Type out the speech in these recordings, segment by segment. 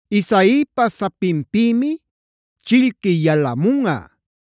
Isaipaa sapinpïmi chillqui yalamunꞌa;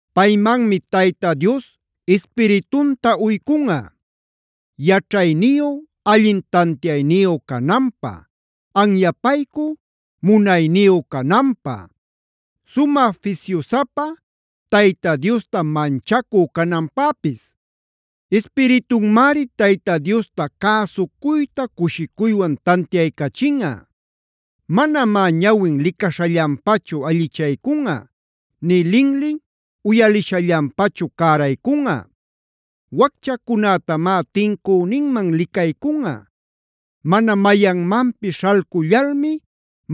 Paymanmi Tayta Dios Ispiritunta uycunꞌa: Yaćhayniyu, allin tantiayniyu cananpä; anyapaycü, munayniyu cananpä; sumä fisyusapa, Tayta Diosta manchacü cananpäpis. Ispiritunmari Tayta Diosta cäsucuyta cushicuywan tantiaycachinꞌa. Manamá ñawin licaśhallanpachu allichaycunꞌa; nï linlin uyalishallanpachu cäraycunꞌa. Wacchacunätamá tincüninman licaycunꞌa; mana mayanmanpis śhalcullalmi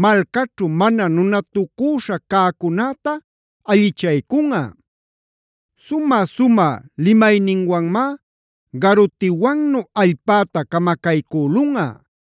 malcaćhu mana nunatucüśha cäcunäta allichaycunꞌa. Sumä-sumä limayninwanmá garutiwannu allpäta camacaycülunꞌa;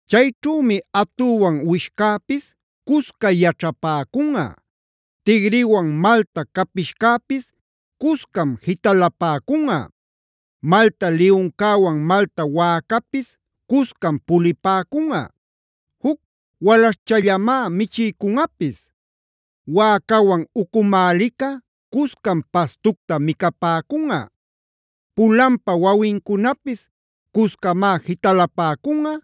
Chayćhümi atüwan uwishcäpis cusca yaćhapäcunꞌa; tigriwan malta capishcäpis cuscam jitalapäcunꞌa; malta liyuncäwan malta wäcapis cuscam pulipäcunꞌa; juc walaśhchallamá michiycunꞌapis. Wäcawan ucumälïca cuscam pastucta micapäcunꞌa; pulanpa wawincunapis cuscamá jitalapäcunꞌa,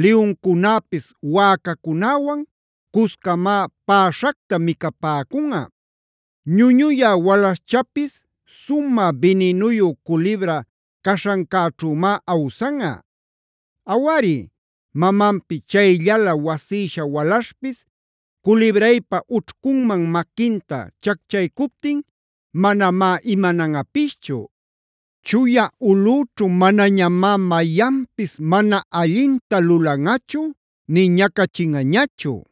liyuncunäpis wäcacunäwan cuscamá päśhacta micapäcunꞌa. Ñuñuya walaśhchapis sumä bininuyu culibra caśhancäćhümá awsanꞌa. Awari, mamanpi chayllalä wasïsha walaśhpis culibraypa ućhcunman maquinta chacchaycuptin manamá imananꞌapischu. Chuya ulꞌüćhu manañamá mayanpis mana allinta lulanꞌachu nï ñacachinꞌañachu.e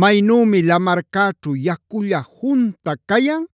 Maynümi lamarcäćhu yaculla junta cayan,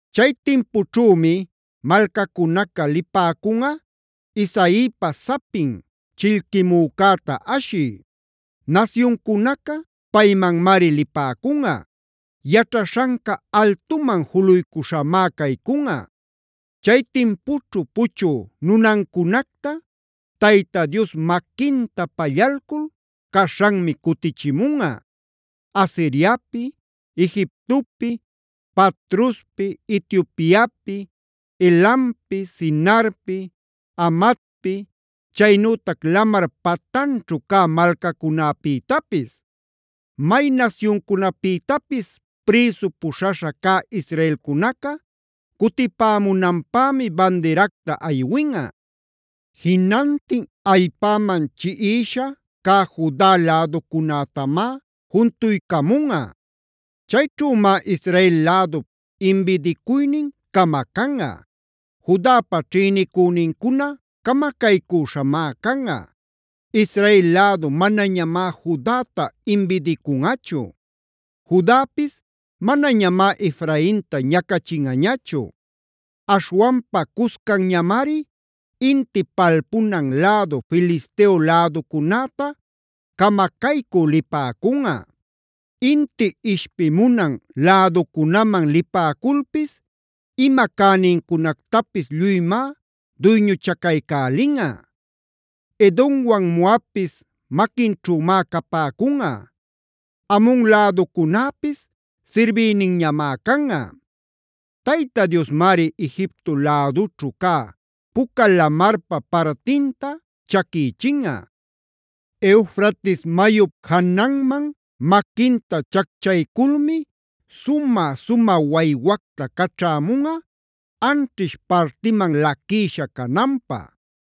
Chay timpućhümi malcacunaca lipäcunꞌa Isaipa sapin chillquimücäta ashï.g Nasyuncunaca paymanmari lipäcunꞌa; yaćhaśhanca altuman juluycuśhamá caycunꞌa. Chay timpućhu puchü nunancunacta Tayta Dios maquinta pallalcul caśhanmi cutichimunꞌa: Asiriapi, Egiptopi, Patrospi, Etiopiapi, Elampi, Sinarpi, Hamatpi, chaynütac lamar patanćhu cä malcacunäpïtapis. May nasyuncunapïtapis prïsu puśhaśha cä israelcunaca cutipämunanpämi bandiracta aywinꞌa. Jinantin allpäman chiꞌisha cä Juda läducunätamá juntuycamunꞌa. Chayćhümá Israelh lädup imbidicuynin camacanꞌa; Judapa ćhïnicünincuna camacaycüśhamá canꞌa. Israel lädu manañamá Judata imbidicunꞌachu; Judapis manañamá Efrainta ñacachinꞌañachu. Aśhwanpa cuscanñamari inti palpunan lädu Filisteo läducunäta camacaycü lipäcunꞌa. Inti ishpimunan läducunaman lipäculpis ima cänincunactapis lluymá duyñuchacaycälinꞌa; Edomwan Moabpis maquinćhümá capäcunꞌa. Amon läducunäpis sirbïninñamá canꞌa. Tayta Diosmari Egipto lädućhu cä Puca Lamarpa partinta chaquïchinꞌa. Eufrates mayup jananman maquinta chacchayculmi sumä-sumä waywacta caćhämunꞌa anćhish partiman laquïsha cananpä.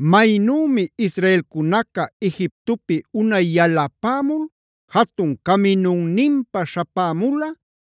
Maynümi israelcunaca Egiptopi unay yalapämul jatun caminunninpa śhapämula,